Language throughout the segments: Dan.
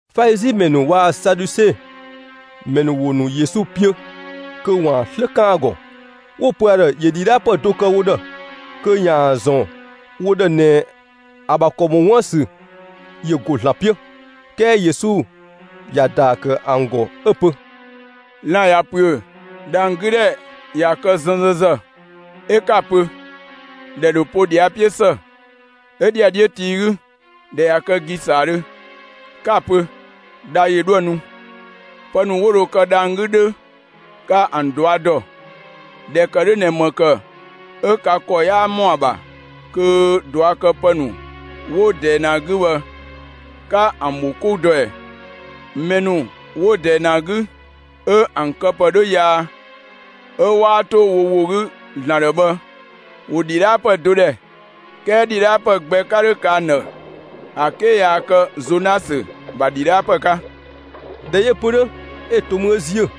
Falizi ‑mɛ ‑nu waa‑ Saduse ‑mɛ ‑nu ‑wo ‑nu Yesu 'piö kö ‑waan 'slë 'kan ‑a ‑gɔ, 'wo‑ pö ‑a ‑dhë ‑yö ‑dhidhaapë do kë wo ‑dhë, kö ‑yaan ‑zɔn wo ‑dhë ꞊nɛ ‑a ‑bha ‑kɔ ‑mɔ 'wun ‑bha ‑sü ‑yö ‑go ‑Zlan 'piö. 'Kɛɛ Yesu ‑ya ‑daa ‑kë ‑an ‑gɔ 'ö‑ pö: «Lan‑ ꞊ya ‑püö, dhang‑ 'gü ‑dhɛ ꞊ya kë 'zɛnzɛnzë, 'ö 'ka‑ pö: ‹‑Dhɛ ‑dho po ꞊dhia 'piö ‑së.› 'Ö ‑dhiadhiö tii 'gü, ‑dhɛ ꞊ya kë ‑gisaadhö, 'ka‑ pö: ‹Dha ‑yö 'dhoë‑ nu›. Pë ‑nu 'wo dho kë dhang‑ 'gü 'dhö, ka ‑an ꞊dɔa' ‑dɔ, ꞊dhɛ ‑kë 'dhö ꞊nɛ ‑më ‑kë 'ö ka ‑kɔ 'yaa ‑mɔ ‑a ‑bha kö ꞊duakëpë ‑nu 'wo ꞊dɛɛ ꞊nɛ ‑a 'gü bhë, 'ka ‑an ‑bho 'kou dɔ ꞊ɛ? Mɛ ‑nu 'wo ꞊dɛɛ ꞊nɛ ‑a 'gü 'ö ‑an këpë 'dhö yaa, 'ö 'waa 'to wo ‑wo 'gü ‑Zlan ‑dhë bhë ‑wo ‑dhidhaapë do ‑dhɛ, 'kɛɛ ‑dhidhaapë gbɛ 'ka 'dho kë ‑an ‑dhë ‑a 'ke yaa kë Zonasö ‑bha ‑dhidhaapë 'ka.» ꞊Dhɛ 'yö‑ pö 'dhö, 'ö to mü 'ö ‑ziö.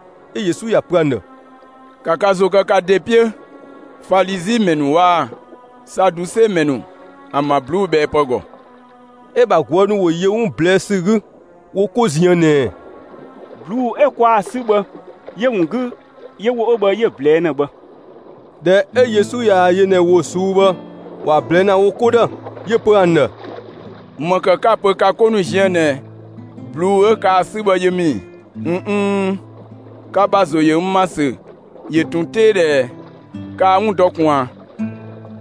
'Ö Yesu ‑ya pö ‑an ‑dhë: «‑Ka ka ‑zo kë ka ‑de 'piö, Falizi ‑mɛ ‑nu waa‑ Saduse ‑mɛ ‑nu ‑an ‑bha ꞊bluubhɛɛpë ‑gɔ!» 'Ö‑ ‑bha ꞊guë' ‑nu ‑wo yö 'wun ꞊blɛɛ'‑ ‑sü 'gü wo 'ko ziën ꞊nɛɛ: «꞊Bluu'‑ 'ö kwaa ‑a 'sü bhë, 'yö‑ ‑wun 'gü 'yö ‑wo 'ö bhë 'yö‑ ꞊blɛɛ'‑ ‑na bhë.» ꞊Dhɛ 'ö Yesu ꞊yaa‑ yö ꞊nɛ ‑wo ꞊suu'‑ bhë ‑wa ꞊blɛɛ'‑ ‑na wo 'ko ‑dhë, 'yö‑ pö ‑an ‑dhë: «‑Më ‑kë 'ka‑ pö ka 'ko ziën ꞊nɛ ꞊bluu'‑ 'ö kaa‑ 'sü bhë yö ‑mü ‑i? ꞊N nn, ka ‑bha ‑zo ‑yö n ‑ma ‑sü ‑yö ꞊tun 'tee ꞊dhɛɛ! Kaa‑ 'wun dɔ ꞊kun ꞊a?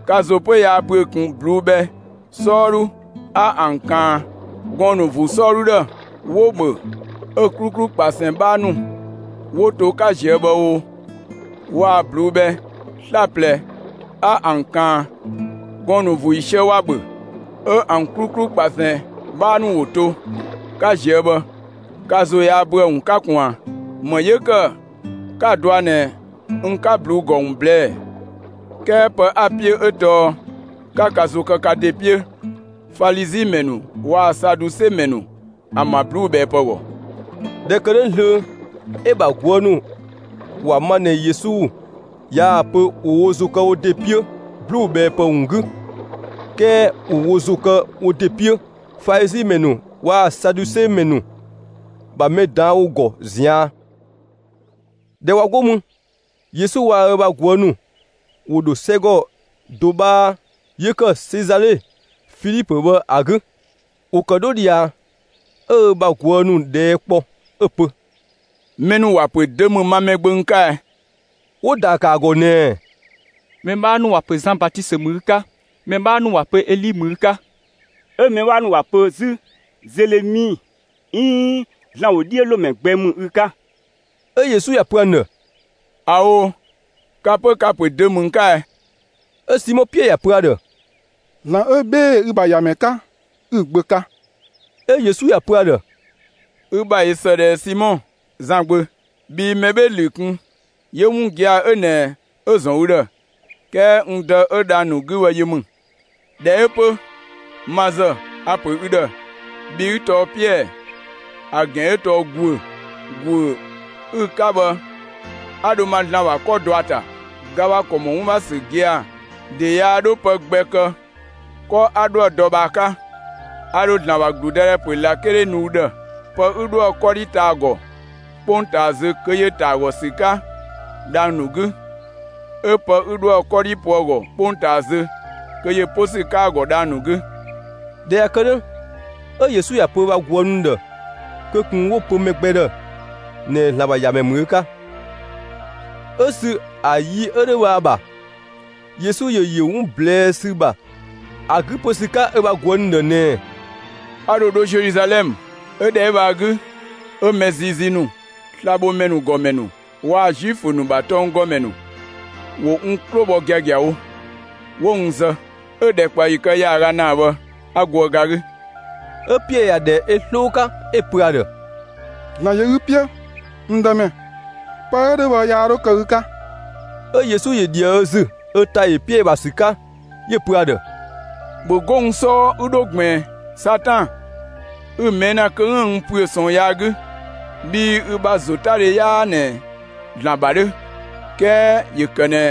Ka ‑zo 'pö yaa ‑büö ꞊kun ꞊bluu'‑ bhɛ 'sɔɔdhu 'a ‑an ꞊kaan 'ö gɔɔn‑ ‑nu ‑vuu 'sɔɔdhu ‑dhë, 'wo‑ ‑bhö, 'ö‑ 'kluklu ꞊kpasɛn 'bhaa ‑nu 'wo to 'ka ꞊zië' bhë o, waa‑ ꞊bluu'‑ bhɛ 'slaplɛ 'a ‑an ꞊kaan gɔɔn‑ ‑vuu ‑yiisië, ‑wa ‑bhö, 'ö ‑an 'kluklu ꞊kpasɛn 'bhaa ‑nu 'wo to, 'ka ꞊zië' bhë, ka ‑zo yaa ‑büö ‑a ‑wun 'ka ꞊kun ꞊a? ‑Më 'yö ‑kë 'kaa‑ dɔa ꞊nɛ n 'ka ꞊bluu'‑ ‑gɔ ‑wun ꞊blɛɛ'‑ ‑ɛ? 'Kɛɛ pë 'a‑ 'piö 'ö tɔɔ 'ka ka ‑zo kë ka ‑de 'piö, Falizi ‑mɛ ‑nu waa‑ Saduse ‑mɛ ‑nu ‑bha ꞊bluubhɛɛpë ‑gɔ.» ꞊Dhɛ ‑kë 'dhö zlöö, 'ö‑ ‑bha ꞊guë' ‑nu ‑wa ma ꞊nɛ Yesu yaa‑ pö ‑wo wo ‑zo kë wo ‑de 'piö ꞊bluubhɛɛpë ‑wun 'gü, 'kɛɛ ‑wo wo ‑zo ‑kë wo ‑de 'piö Falizi ‑mɛ ‑nu waa‑ Saduse ‑mɛ ‑nu ‑bha mɛ ꞊daan' ‑wo ‑gɔ ꞊zian'. ꞊Dhɛ ꞊wa 'go mü, Yesu waa‑ ö ‑bha ꞊guë' ‑nu ‑wo ‑dho 'sɛgɔ do 'bhaa 'yö ‑kë Sezale Filipö bhë ‑a 'gü. ‑Wo ‑kë 'dho ꞊dhia, 'ö ö ‑bha ꞊guë' ‑nu ꞊dhɛɛ' kpɔ 'ö‑ pö: «Mɛ ‑nu ‑wa ‑pö dö ‑mü ma Mɛgbö n 'ka ɛ?» 'Wo‑ ‑daa ‑kë ‑a ‑gɔ ꞊nɛɛ: «Mɛ 'bhaa ‑nu ‑wa ‑pö Zan Batisö ‑mü ü 'ka, mɛ 'bhaa ‑nu ‑wa ‑pö Eli ‑mü ü 'ka, 'ö mɛ 'bhaa ‑nu ‑wa ‑pö 'zü Zelemi 'iin ‑Zlan ‑wodhiölomɛ gbɛ ‑mü ü 'ka.» 'Ö Yesu ‑ya pö ‑an ‑dhë: «꞊Ao', ka 'pö, ka‑ ‑pö dö ‑mü n 'ka ꞊ɛ?» 'Ö Simɔ Piɛɛ ‑ya pö ‑a ‑dhë: «‑Zlan 'ö 'bhee‑ ü‑ ‑bha ‑Yamɛ 'ka, 'ü‑ Gbö 'ka.» 'Ö Yesu ‑ya pö ‑a ‑dhë: «Ü ‑bha ꞊yö ‑së ꞊dhɛɛ, Simɔ, Zan gbö. Bhii mɛ 'bhee‑ ‑lü kun 'yö 'wun gia‑ 'ö ꞊nɛ 'ö‑ ‑zɔn ü ‑dhë, 'kɛɛ n Dë 'ö dhang‑ ‑nu 'gü bhë yö ‑mü. ꞊Dhɛ 'ö 'pö, ma ‑zë, a‑ ‑pö ü ‑dhë: Bhi ü tɔɔ Piɛɛ, (‑a ‑gɛn 'ö tɔɔ «‑guö»). ‑Guö 'ü‑ 'ka bhë 'a dho ma ‑Zlan ‑bha 'kɔ dɔ ü ‑ta. Ga ‑bha ‑kɔ ‑mɔ 'wun ‑bha ‑sü gia‑ ‑de yaa 'dho pë gbɛ kë 'kɔ 'a 'dhoë‑ dɔ bhë ‑a 'ka. A ‑dho ‑Zlan ‑bha ‑gludëdhɛ ‑pö ꞊lakele nu ü ‑dhë. Pë 'ü 'dhoë‑ 'kɔdhi ta ‑a ‑gɔ 'kpongtaa zö kö ‑yö ‑ta ‑a ‑gɔ ‑sü 'ka dhang‑ ‑nu 'gü; 'ö pë 'ü 'dhoë‑ 'kɔdhi po ‑a ‑gɔ 'kpongtaa zö, kö ‑yö 'po ‑sü 'ka ‑a ‑gɔ dhang‑ ‑nu 'gü.» ꞊Dhɛ ꞊ya kë 'dhö, 'ö Yesu ‑ya pö ö bha ꞊guë' ‑nu ‑dhë kö ꞊kun 'wo‑ pö mɛ gbɛ ‑dhë ꞊nɛ ‑Zlan ‑bha ‑Yamɛ ‑mü ö 'ka. 'Ö sü ‑a yi 'ö 'dhö bhë ‑a ‑bha, Yesu ‑yö ‑yö 'wun ꞊blɛɛ' ‑sü ‑bha ‑a 'gü 'po ‑sü 'ka ö bha ꞊guë' ‑nu ‑dhë ꞊nɛɛ: «A ‑dho dho Zeluzalɛmë; 'ö ‑dhɛ 'ö bhë ‑a 'gü, 'ö mɛ ziizii ‑nu, slabhomɛ ‑nu ‑gɔmɛ ‑nu waa‑ Zuifö ‑nu ‑bha tɔnggɔmɛ ‑nu, ‑wo n 'klo bhɔ giagiawo, 'wo n zë; 'ö‑ ‑dhɛkpaɔyi kë ‑yaaga ‑naa bhë 'a goë ga 'gü.» 'Ö Piɛɛ ‑ya ‑dhɛ ö 'sloo 'ka, 'ö‑ pö ‑a ‑dhë: «‑Zlan ‑yö ü 'piö, n Dëmɛ, pë 'ö 'dhö bhë yaa 'dho kë ü 'ka!» 'Ö Yesu ‑yö ꞊dhië ö ‑zü 'ö ‑ta ‑yö Piɛɛ ‑bha ‑sü 'ka 'yö‑ pö ‑a ‑dhë: «‑Bhö 'go n 'sɔɔ 'ü 'dho ꞊gbiin, Satan, 'ü‑ ꞊mɛɛ' ‑na kö 'üën‑ n ‑püö ꞊sɔɔn yaa 'gü; bhii ü bha ‑zotadhe 'yaa ꞊nɛ ‑Zlan ‑bha 'dhö; 'kɛɛ ‑yö ‑kë ꞊nɛ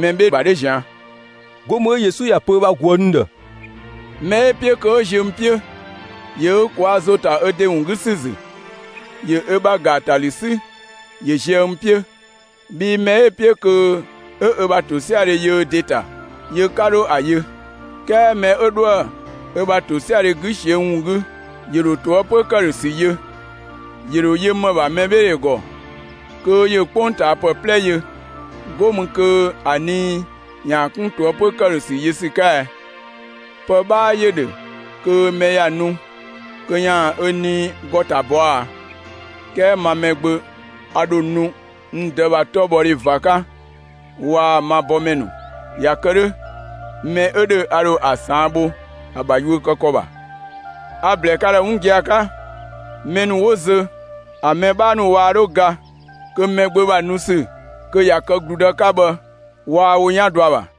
mɛ 'bhee‑ ‑bha 'dhö ꞊zian'.» 'Go mü 'ö Yesu ‑ya pö ö bha ꞊guë' ‑nu ‑dhë: «Mɛ 'ö‑ 'piö kö 'ö ziö n 'piö, ‑yö ö ꞊kwaa' ‑zo 'ta ö ‑de ‑wun 'gü ‑sü ‑zü, ‑yö ö ‑bha ‑gaatalü 'sü ‑yö zië n 'piö! Bhii mɛ 'ö‑ 'piö kö 'ö ö ‑bha ‑tosiadhe yö ö ‑de ‑ta, ‑yö 'ka 'dho ‑a yö; 'kɛɛ mɛ 'ö 'dhoë‑ ö ‑bha ‑tosiadhe 'gü ꞊siö n ‑wun 'gü, ‑yö ‑dho ꞊toëpö ‑këdhösü yö. ‑Yö ‑dho yö ‑më ‑bha mɛbheedhɛ ‑gɔ, kö ‑yö 'kpongtaapë 'plɛ yö, 'go mü kö ‑a nii ‑yaan 'kun ꞊toëpö ‑këdhösü yö ‑sü 'ka ɛ? Pë 'bhaa ‑yö ‑dhö kö mɛ ‑ya nu kö ‑yaan ö nii ‑gɔ ‑ta ‑bɔa ‑a? 'Kɛɛ ma Mɛgbö a ‑dho nu n Dë ‑bha 'tɔbhɔdhe ꞊va 'ka waa‑ ma bɔmɛ ‑nu. ꞊Ya kë 'dhö, mɛ 'ö ‑dhö a ‑dho ‑a ꞊saan' bho ‑a ‑bha yuö kë ‑kɔ ‑bha. A‑ ‑blɛɛ ka ‑dhë 'wun gia‑ 'ka: Mɛ ‑nu 'wo zö ‑an mɛ 'bhaa ‑nu waa 'dho ga kö Mɛgbö ‑bha nu ‑sü kö ꞊ya kë ‑gludë 'ka bhë waa wo 'yan dɔ ‑a ‑bha.»